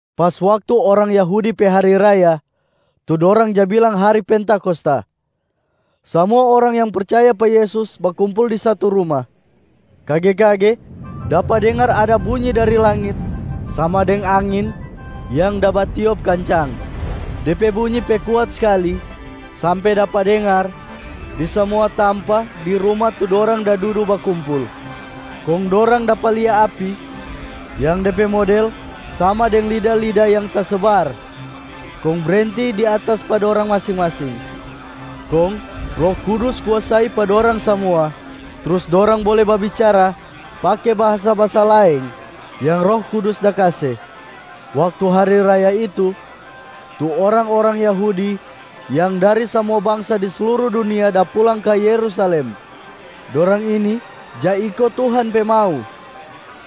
Pas waktu orang Yahudi pe hari raya, tu dorang ja bilang hari Pentakosta, samua orang yang percaya pa Yesus bakumpul di satu ruma. Kage-kage dapa dengar ada bunyi dari langit sama deng angin yang da batiop kancang. De pe bunyi pe kuat skali sampe dapa dengar di samua tampa di ruma tu dorang da dudu bakumpul. Kong dorang dapa lia api yang de pe model sama deng lida-lida yang tasebar kong brenti di atas pa dorang masing-masing. Kong Roh Kudus kuasai pa dorang samua, trus dorang bole babicara pake bahasa-bahasa laeng yang Roh Kudus da kase. Waktu hari raya itu, tu orang-orang Yahudi yang dari samua bangsa di sluru dunia da pulang ka Yerusalem. Dorang ini ja iko Tuhan pe mau.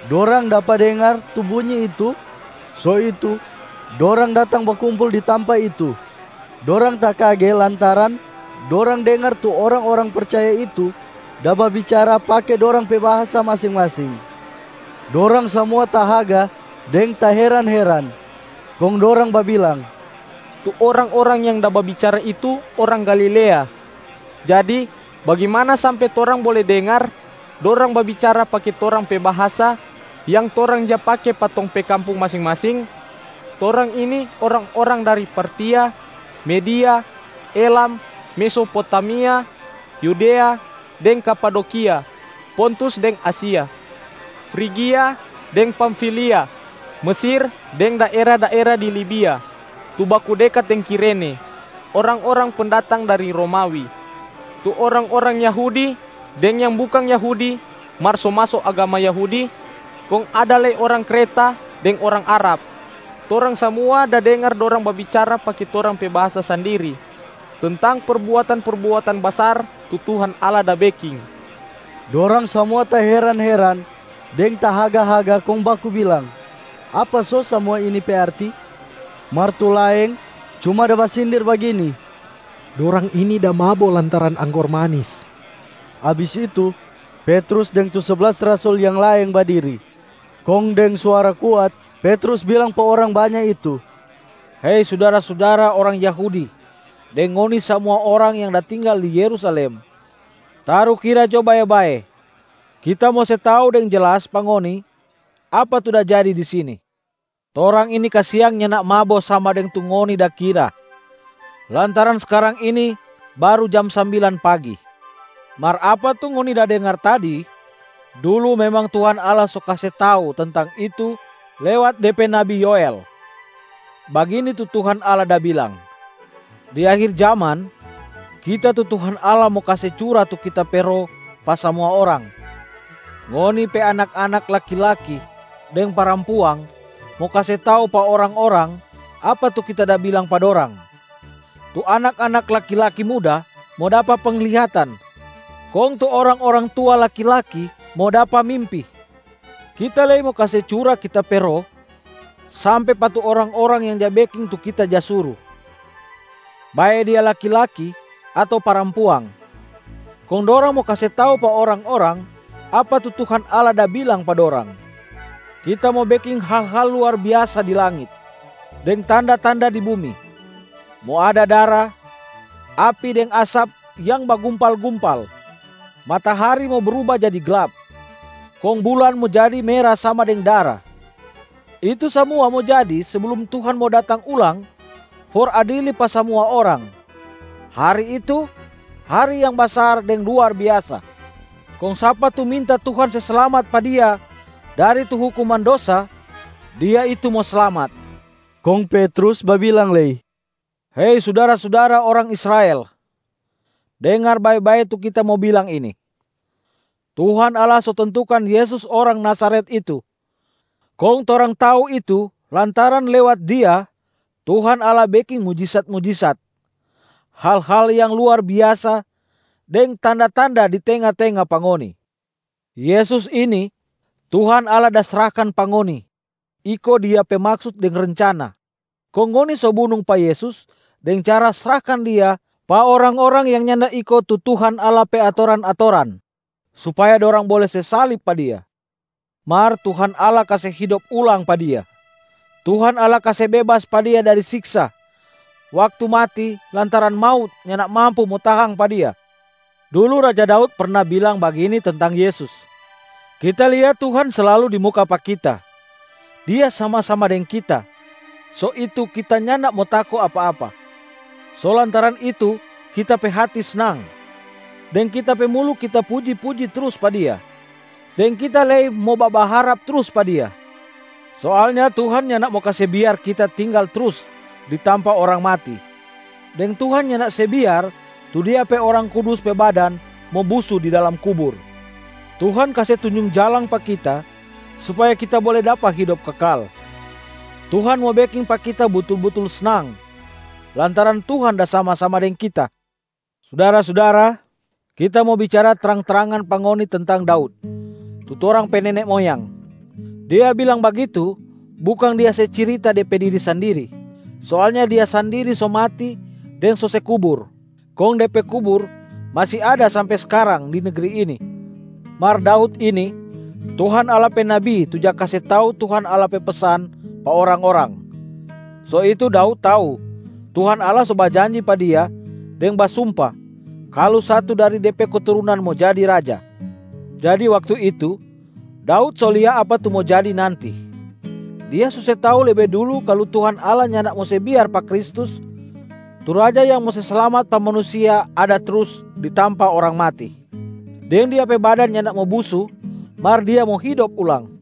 Dorang dapa dengar tu bunyi itu, so itu dorang datang bakumpul di tampa itu. Dorang takage lantaran dorang dengar tu orang-orang percaya itu da babicara pake dorang pe bahasa masing-masing. Dorang samua tahaga deng taheran-heran, kong dorang babilang, “Tu orang-orang yang da babicara itu orang Galilea. Jadi bagimana sampe torang bole dengar dorang babicara pake torang pe bahasa yang torang ja pake pa tong pe kampung masing-masing? Torang ini orang-orang dari: Partia, Media, Elam, Mesopotamia, Yudea deng Kapadokia, Pontus deng Asia, Frigia deng Pamfilia, Mesir deng daera-daera di Libia tu baku dekat deng Kirene, orang-orang pendatang dari Romawi, tu orang-orang Yahudi deng yang bukang Yahudi mar so maso agama Yahudi, kong ada lei orang Kreta deng orang Arab. Torang samua da dengar dorang babicara pake torang pe bahasa sandiri tentang perbuatan-perbuatan basar tu Tuhan Allah da beking.” Dorang samua taheran-heran deng tahaga-haga kong baku bilang, “Apa so samua ini pe arti?” Mar tu laeng cuma da basindir bagini, “Dorang ini da mabo lantaran anggor manis.” Abis itu, Petrus deng tu seblas rasul yang laeng badiri. Kong deng suara kuat Petrus bilang pa orang banya itu, “Hei sudara-sudara orang Yahudi deng ngoni samua orang yang da tinggal di Yerusalem. Tarukira jo bae-bae, kita mo se tau deng jelas pa ngoni apa tu da jadi di sini. Torang ini kasiang nyanda mabo sama deng tu ngoni da kira, lantaran skarang ini baru jam sambilan pagi. Mar apa tu ngoni da dengar tadi, dulu memang Tuhan Allah so kase tau tentang itu lewat De pe nabi Yoel, bagini tu Tuhan Allah da bilang, ‘Di akhir jaman, Kita tu Tuhan Allah mo kase cura tu Kita pe Roh pa samua orang. Ngoni pe anak-anak laki-laki deng parampuang mo kase tau pa orang-orang apa tu Kita da bilang pa dorang. Tu anak-anak laki-laki muda mo dapa penglihatan, kong tu orang-orang tua laki-laki mo dapa mimpi. Kita lei mo kase cura Kita pe Roh sampe pa tu orang-orang yang ja beking tu Kita ja suru, bae dia laki-laki ato parampuang, kong dorang mo kase tau pa orang-orang apa tu Tuhan Allah da bilang pa dorang. Kita mo beking hal-hal luar biasa di langit, deng tanda-tanda di bumi: mo ada dara, api deng asap yang bagumpal-gumpal. Matahari mo bruba jadi glap, kong bulan mo jadi mera sama deng dara. Itu samua mo jadi seblum Tuhan mo datang ulang for adili pa samua orang. Hari itu, hari yang basar deng luar biasa. Kong sapa tu minta Tuhan se slamat pa dia dari tu hukuman dosa, dia itu mo slamat.’” Kong Petrus babilang lei, “Hei sudara-sudara orang Israel! Dengar bae-bae tu kita mo bilang ini: Tuhan Allah so tentukan Yesus orang Nazaret itu, kong torang tau itu lantaran lewat Dia, Tuhan Allah beking mujisat-mujisat, hal-hal yang luar biasa deng tanda-tanda di tenga-tenga pa ngoni. Yesus ini, Tuhan Allah da srahkan pa ngoni iko Dia pe maksut deng rencana. Kong ngoni so bunung pa Yesus deng cara srahkan Dia pa orang-orang yang nyanda iko tu Tuhan Allah pe atoran-atoran, supaya dorang bole se salib pa Dia. Mar Tuhan Allah kase hidop ulang pa Dia, Tuhan Allah kase bebas pa Dia dari siksa waktu mati lantaran maut nyanda mampu mo tahang pa Dia. Dulu Raja Daud perna bilang bagini tentang Yesus, ‘Kita lia Tuhan slalu di muka pa kita. Dia sama-sama deng kita, so itu kita nyanda mo tako apa-apa. So lantaran itu kita pe hati snang, deng kita pe mulu kita puji-puji trus pa Dia, deng kita lei mo babaharap trus pa Dia. Soalnya Tuhan nyanda mo kase biar kita tinggal trus di tampa orang mati, deng Tuhan nyanda se biar tu Dia pe Orang Kudus pe badan mo busu di dalam kubur. Tuhan kase tunjung jalang pa kita supaya kita bole dapa hidop kekal. Tuhan mo beking pa kita butul-butul snang lantaran Tuhan da sama-sama deng Kita.’ Sudara-sudara, kita mo bicara trang-trangan pa ngoni tentang Daud, tu torang pe nene moyang. Dia bilang bagitu, bukang dia se cirita de pe diri sandiri. Soalnya dia sandiri so mati deng so se kubur, kong de pe kubur masi ada sampe skarang di negri ini. Mar Daud ini Tuhan Allah pe nabi tu ja kase tau Tuhan Allah pe pesan pa orang-orang. So itu Daud tau Tuhan Allah so bajanji pa dia deng basumpa kalu satu dari de pe keturunan mo jadi raja. Jadi waktu itu, Daud so lia apa tu mo jadi nanti. Dia so se tau lebe dulu kalu Tuhan Allah nyanda mo se biar pa Kristus tu Raja yang mo se slamat pa manusia ada trus di tampa orang mati, deng Dia pe badan nyanda mo busu mar Dia mo hidop ulang.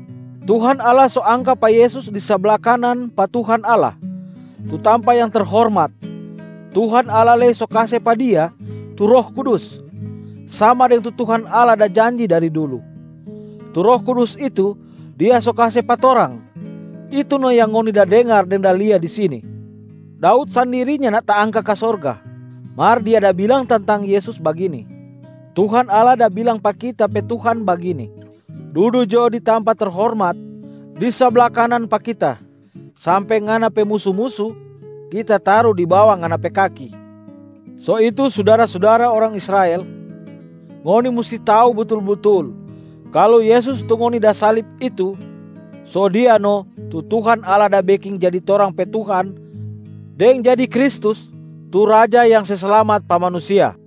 Tuhan Allah so angka pa Yesus di sabla kanan pa Tuhan Allah, tu tampa yang terhormat. Tuhan Allah lei so kase pa Dia tu Roh Kudus, sama deng tu Tuhan Allah da janji dari dulu. Tu Roh Kudus itu Dia so kase pa torang, itu no yang ngoni da dengar deng da lia di sini. Daud sandiri nyanda taangka ka sorga, mar dia da bilang tentang Yesus bagini, ‘Tuhan Allah da bilang pa kita pe Tuhana bagini, Dudu jo di tampa terhormat di sabla kanan pa Kita, sampe Ngana pe musu-musu Kita taru di bawa Ngana pe kaki.’ So itu sudara-sudara orang Israel, ngoni musti tau butul-butul kalu Yesus tu ngoni da salib itu, so Dia no tu Tuhan Allah da beking jadi torang pe Tuhan deng jadi Kristus tu Raja yang se slamat pa manusia.”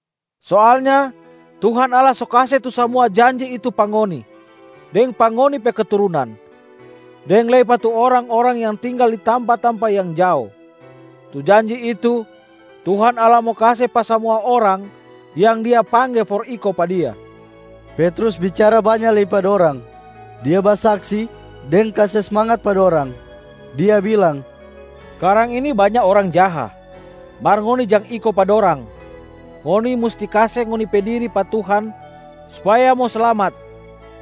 Soalnya Tuhan Allah so kase tu samua janji itu pa ngoni deng pa ngoni pe keturunan, deng lei pa tu orang-orang yang tinggal di tampa-tampa yang jao. Tu janji itu Tuhan Allah mo kase pa samua orang yang Dia pangge for iko pa Dia.” Petrus bicara banya lei pa dorang. Dia basaksi deng kase smangat pa dorang, dia bilang, “Skarang ini banya orang jaha, mar ngoni jang iko pa dorang. Ngoni musti kase ngoni pe diri pa Tuhan supaya mo slamat.”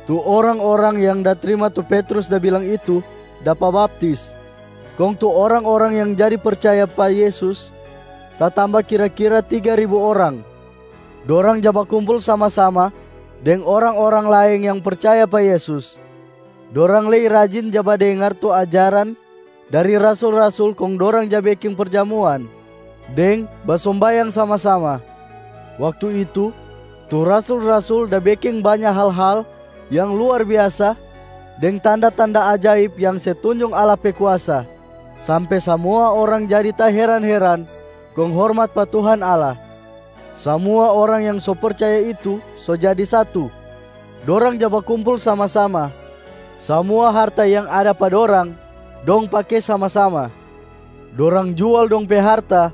Tu orang-orang yang da trima tu Petrus da bilang itu dapa baptis, kong tu orang-orang yang jadi percaya pa Yesus tatamba kira-kira tiga ribu orang. Dorang ja bakumpul sama-sama deng orang-orang laeng yang percaya pa Yesus. Dorang lei rajin ja badengar tu ajaran dari rasul-rasul kong dorang ja beking perjamuan deng basombayang sama-sama. Waktu itu, tu rasul-rasul da beking banya hal-hal yang luar biasa deng tanda-tanda ajaib yang se tunjung Allah pe kuasa, sampe samua orang jadi taheran-heran kong hormat pa Tuhan Allah. Samua orang yang so percaya itu so jadi satu, dorang ja bakumpul sama-sama. Samua harta yang ada pa dorang, dong pake sama-sama. Dorang jual dong pe harta,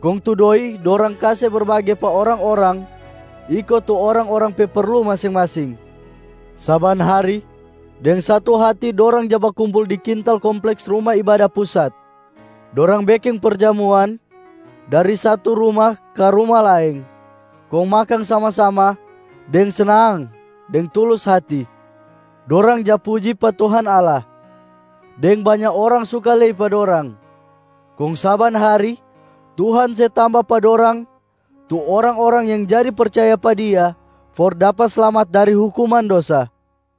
kong tu doi dorang kase berbage pa orang-orang iko tu orang-orang pe perlu masing-masing. Saban hari deng satu hati dorang ja bakumpul di kintal kompleks Ruma Ibada Pusat. Dorang beking perjamuan dari satu ruma ka ruma laeng kong makang sama-sama deng snang deng tulus hati. Dorang ja puji pa Tuhan Allah, deng banya orang suka lei pa dorang. Kong saban hari Tuhan se tamba pa dorang tu orang-orang yang jadi percaya pa Dia for dapa slamat dari hukuman dosa.